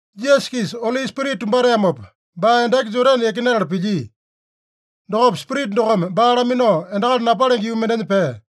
Jisasa-kisa Oli Spirita tumbateamopa, baa endaki Jodane yakinatala pilyia. Dokopa Spirita dokome baa laminao endakali napalenge yuu mendenya pea.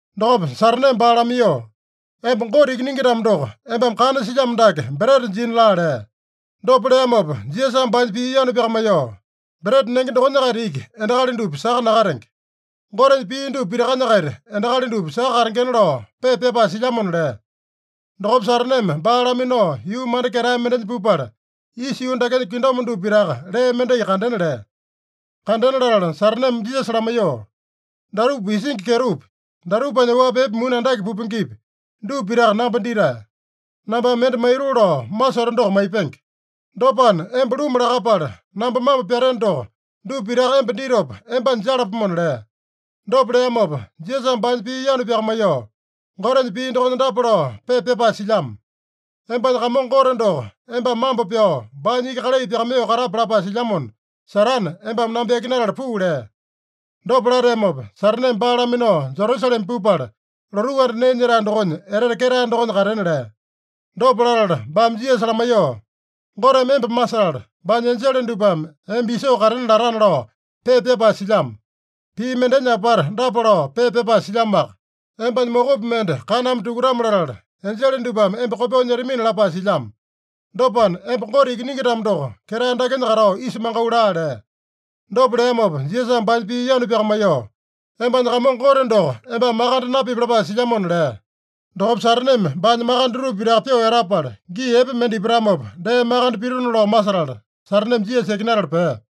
Dokopa Sataneme baa lamaiyoo, “Emba Gote Ikiningi-tamo doko, embame kana silyamo dake breta jina laa” lea. Dopa leamopa Jisasame baanya pii yanu pyakamaiyoo, “ ‘Breta nenge dokonya-kaita iki endakali dupa saka nakatenge. Gotenya pii dupa pitakanya-kaita endakali dupa saka katengena’ lao pepa pyapae silyamona” lea. Dokopa Sataneme baa laminao yuu manda ketae mendenya pupala, isa yuu dakenya kingdom dupa pitaka lee mendai kandena lea. Kandena latala Sataneme Jisasa lamaiyoo, “Datupa isingi kyetopi, datupanya oapi epe muni andake pupengepi, dupa pitaka namba ditae. Nambame mende maitoo lao masoto doko maipenge. Dopana, emba luma lakapala namba mambo pyateno doko, dupa pitaka emba ditopa embanya jalapomona” lea. Dopa leamopa Jisasame baanya pii yanu pyakamaiyoo, “Gotenya pii dokonya dapa lao pepa pyapae silyamo: ‘Embanya Kamongo Gote doko embame mambo pyao, baanya iki kalai pyakamaiyoo katape’ lapae silyamona, Satane, embame namba yakinatala puu” lea. Dopa lateamopa, Sataneme baa laminao Jerusalema pupala, lotuu anda nee nyetae dokonya etete ketae dokonya katena lea. Dopa latala baame Jisasa lamaiyoo, “ ‘Goteme emba masetala, baanya enjele dupame emba isoo katena latana’ lao pepa pyapae silyamo. Pii mendenya apata dapa lao pepa pyapae silyamoaka: ‘Embanya mokopi mende kaname tukutame-latala, enjele dupame emba kopyoo nyetamina’ lapae silyamo. Dopana, emba Gote Ikiningi-tamo doko, ketae dakenya katao isa mangau laa” lea. Dopa leamopa Jisasame baanya pii yanu pyakamaiyoo, “ ‘Embanya Kamongo Gote doko embame makande napipi’ lapae silyamona” lea. Dokopa Sataneme baanya makande dutupa pitaka pyoo etapala, gii epe mende ipatamopa dee makande pitona lao masetala, Sataneme Jisasa yakinatala pea.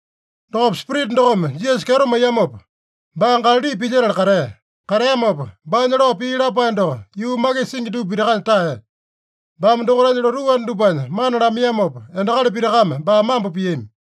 Dokopa Spirita dokome Jisasa kyeto maiyamopa, baa Galali pilyetala katea. Kateamopa, baanya lao pii lapae doko yuu makisa singi dupa pitakanya taeya. Baame dokaitanya lotuu anda dupanya mana lamaiyamopa, endakali pitakame baa mambo piami.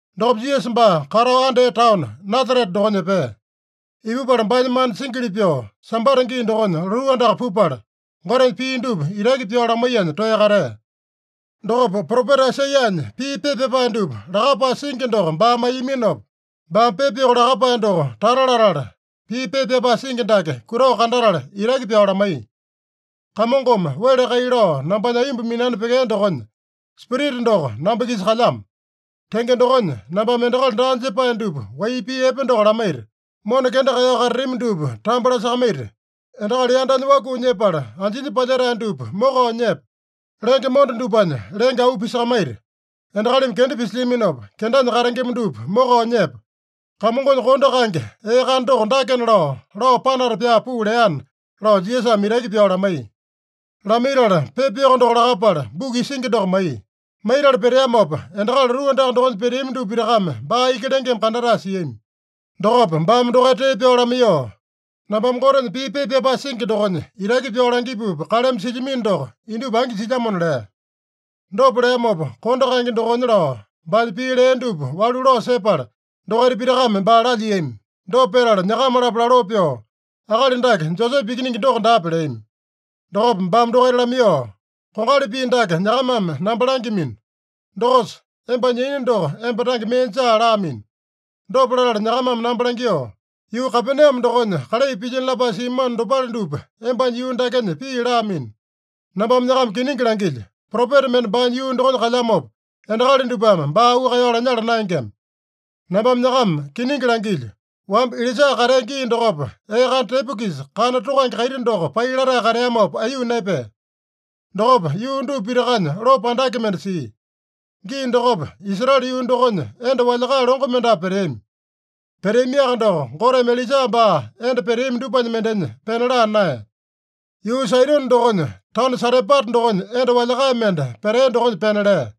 Dokopa Jisasa baa katao andea taono Nasarete dokonya epea. Ipupala baanya mana singili pyoo, Sambata gii dokonya lotuu andaka pupala, Gotenya pii dupa itaki pyao lamaiyanya toeya katea. Dokopa propeta Aisaiyanya pii pepa pyapae dupa lakapae singi doko baa maiyaminopa, baame pepa yoko lakapae doko tata latala, pii pepa pyapae singi dake kutao kandatala itaki pyao lamaiya: “Kamongome wele kai lao nambanya aiyomba minani pyekea dokonya, Spirita doko namba-kisa kalyamo. Tenge dokonya, nambame endakali daa jepae dupa wai pii epe doko lamaita, mona kenda kaeyao katatami dupa tambo lasakamaita, endakali yandanya wakuu nyepala anjinya palyetae dupa mokao nyepa, lenge monda dupanya lenge auu pisakamaita, endakalimi kenda pisilyaminopa kendanya katengema dupa mokao nyepa, Kamongonya kondo kaenge ee kana doko dakena lao, lao panata pyaa puu leana” lao Jisasame itaki pyao lamaiya. Lamaitala, pepa yoko doko lakapala, buku isingi doko maiya. Maitala peteamopa, endakali lotuu andaka dokonya peteami dupa pitakame baa iki lengeme kandatae siami. Dokopa baame dokaita tee pyao lamaiyoo, “Nambame Gotenya pii pepa pyapae singi dokonya itaki pyao langipupa kaleme silyamino doko indupa angi jilyamona” lea. Dopa leamopa, kondo kaenge dokonya lao baanya pii lea dupa walu lao sepala, dokaita pitakame baa lalyiami. Dopa petala nyakama-lapo laloo pyoo, “Akali dake Josepe ikiningi doko daape?” leami. Dokopa baame dokaita lamaiyoo, “Kongali pii dake nyakamame namba langyamino: ‘Dokosa, embanya yaina doko emba tange mee jaa’ laamino. Dopa latala nyakamame namba langyoo, ‘Yuu Kapename dokonya kalai pilyino lapae simano dopale dupa embanya yuu dakenya pii’ laamino. Nambame nyakama kiningi langilyo: Propeta mende baanya yuu dokonya kalyamopa, endakali dupame baa auu kaeyao lanyala naengema. Nambame nyakama kiningi langilyo: Wamba Ilaija katea gii dokopa, ee kana tepo-kisa, kana tokange kaiti doko pai latae kateamopa, aiyuu naepea. Dokopa yuu dupa pitakanya lopo andake mende sia. Gii dokopa, Israele yuu dokonya enda walyakae longo mendapu peteami. Peteamiaka doko, Goteme Ilaija baa enda peteami dupanya mendenya pena laa naeya. Yuu Saidone dokonya taono Sarepata dokonya enda walyakae mende petea dokonya pena lea.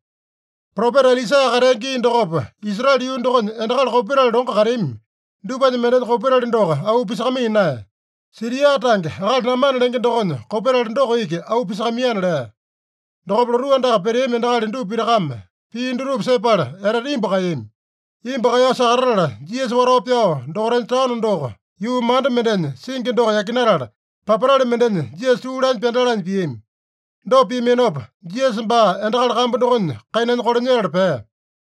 Propeta Elisa katea gii dokopa, Israele yuu dokonya endakali kopetali longo kateami dupanya mendenya kopetali doko auu pisakamaiya naeya. Siria tange akali Namane lenge dokonya kopetali doko iki auu pisakamaiyana” lea. Dokopa lotuu andaka peteami endakali dupa pitakame pii dutupa sepala etete imbu kaeyami. Imbu kaeyao sakatatala, Jisasa watao pyao dokaitanya taono doko yuu manda mendenya singi doko yakinatala, papatale mendenya Jisasa tuu lanya pyandalanya piami. Dopa piaminopa, Jisasa baa endakali kambu dokonya kainanya kolanyetala pea.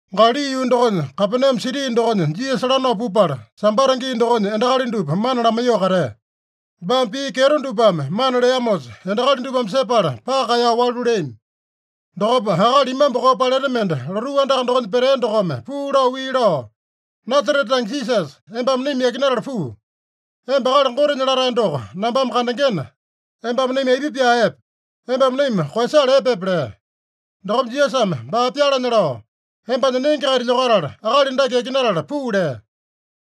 Galali yuu dokonya Kapename siti dokonya Jisasa lanao pupala, Sambata gii dokonya endakali dupa mana lamaiyoo katea. Baame pii kyeto dupame mana leamosa, endakali dupame sepala paka kaeyao walu leami. Dokopa akali imambu koo paleta mende lotuu andaka dokonya petea dokome puu lao wii lao, “Nasarete tange Jisasa, embame naima yakinatala puu. Emba Akali Gotenya Latae doko nambame kandengena, embame naima aipa pyaa epe? Embame naima koeyasala epepe?” lea. Dokopa Jisasame baa pyalanya lao, “Embanya nenge-kaita lyokatala, akali dake yakinatala puu” lea.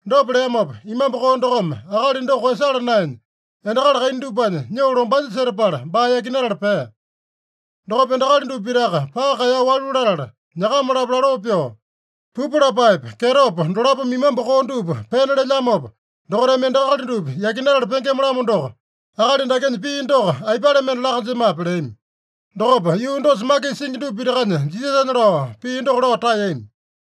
Dopa leamopa, imambu koo dokome akali doko koeyasala naenya, endakali kaina dupanya nyoo lombanya setapala baa yakinatala pea. Dokopa endakali dupa pitaka paka kaeyao walu latala, nyakama-lapo laloo pyoo, “Pupu lapaepa, kyetopa dolapome imambu koo dupa pena lelyamopa, dokaitame endakali dupa yakinatala pengema-lamo doko, akali dakenya pii doko aipale mende laa-kanjemape?” leami. Dokopa yuu dosa makisa singi dupa pitakanya Jisasanya lao pii doko lao taeyami.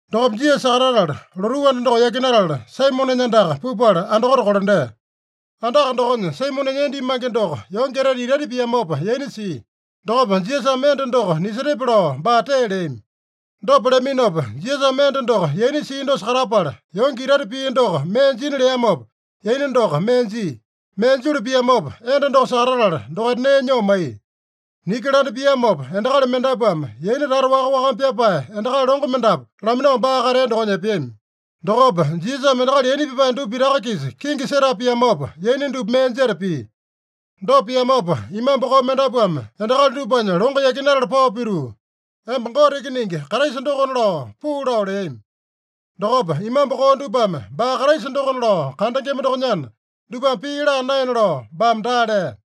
Dokopa Jisasa sakatatala, lotuu anda doko yakinatala, Saimonenya andaka pupala andakote kolandea. Andaka dokonya Saimonenya enda imange doko yonge etete itaita piamopa yaina sia. Dokopa Jisasame enda doko nisetepe lao baa tee leami. Dopa leaminopa Jisasame enda doko yaina sia dosa katapala, yonge itaita pia doko mee jina leamopa, yaina doko mee jia. Mee julu piamopa, enda doko sakatatala, dokaita nee nyoo maiya. Niki landa piamopa, endakali mendapuame yaina tata waka-wakame pyapae endakali longo mendapu laminao baa katea dokonya epeami. Dokopa Jisasame endakali yaina pyapae dupa pitaka-kisa kingi setapa piamopa, yaina dupa mee jeta pia. Dopa piamopa, imambu koo mendapuame endakali dupanya longo yakinatala pao pituu, “Emba Gote Ikiningi Kraisa dokona” lao puu lao leami. Dokopa, imambu koo dupame baa Kraisa dokona lao kandengema dokonyana, dupame pii laa naena lao baame daa lea.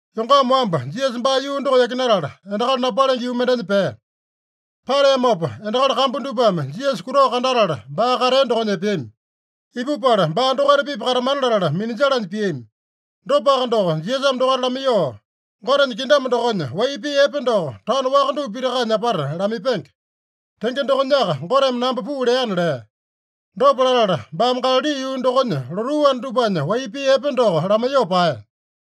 Yongama wamba, Jisasa baa yuu doko yakinatala, endakali napalenge yuu mendenya pea. Pateamopa, endakali kambu dupame Jisasa kutao kandatala, baa katea dokonya epeami. Ipupala, baa dokaita-pipa katamana latala minanjalanya piami. Dopaka doko Jisasame dokaita lamaiyoo, “Gotenya kingdom dokonya wai pii epe doko taono waka dupa pitakanya apata lamaipenge. Tenge dokonyaka Goteme namba puu leana” lea. Dopa latala baame Galali yuu dokonya lotuu anda dupanya wai pii epe doko lamaiyoo paeya.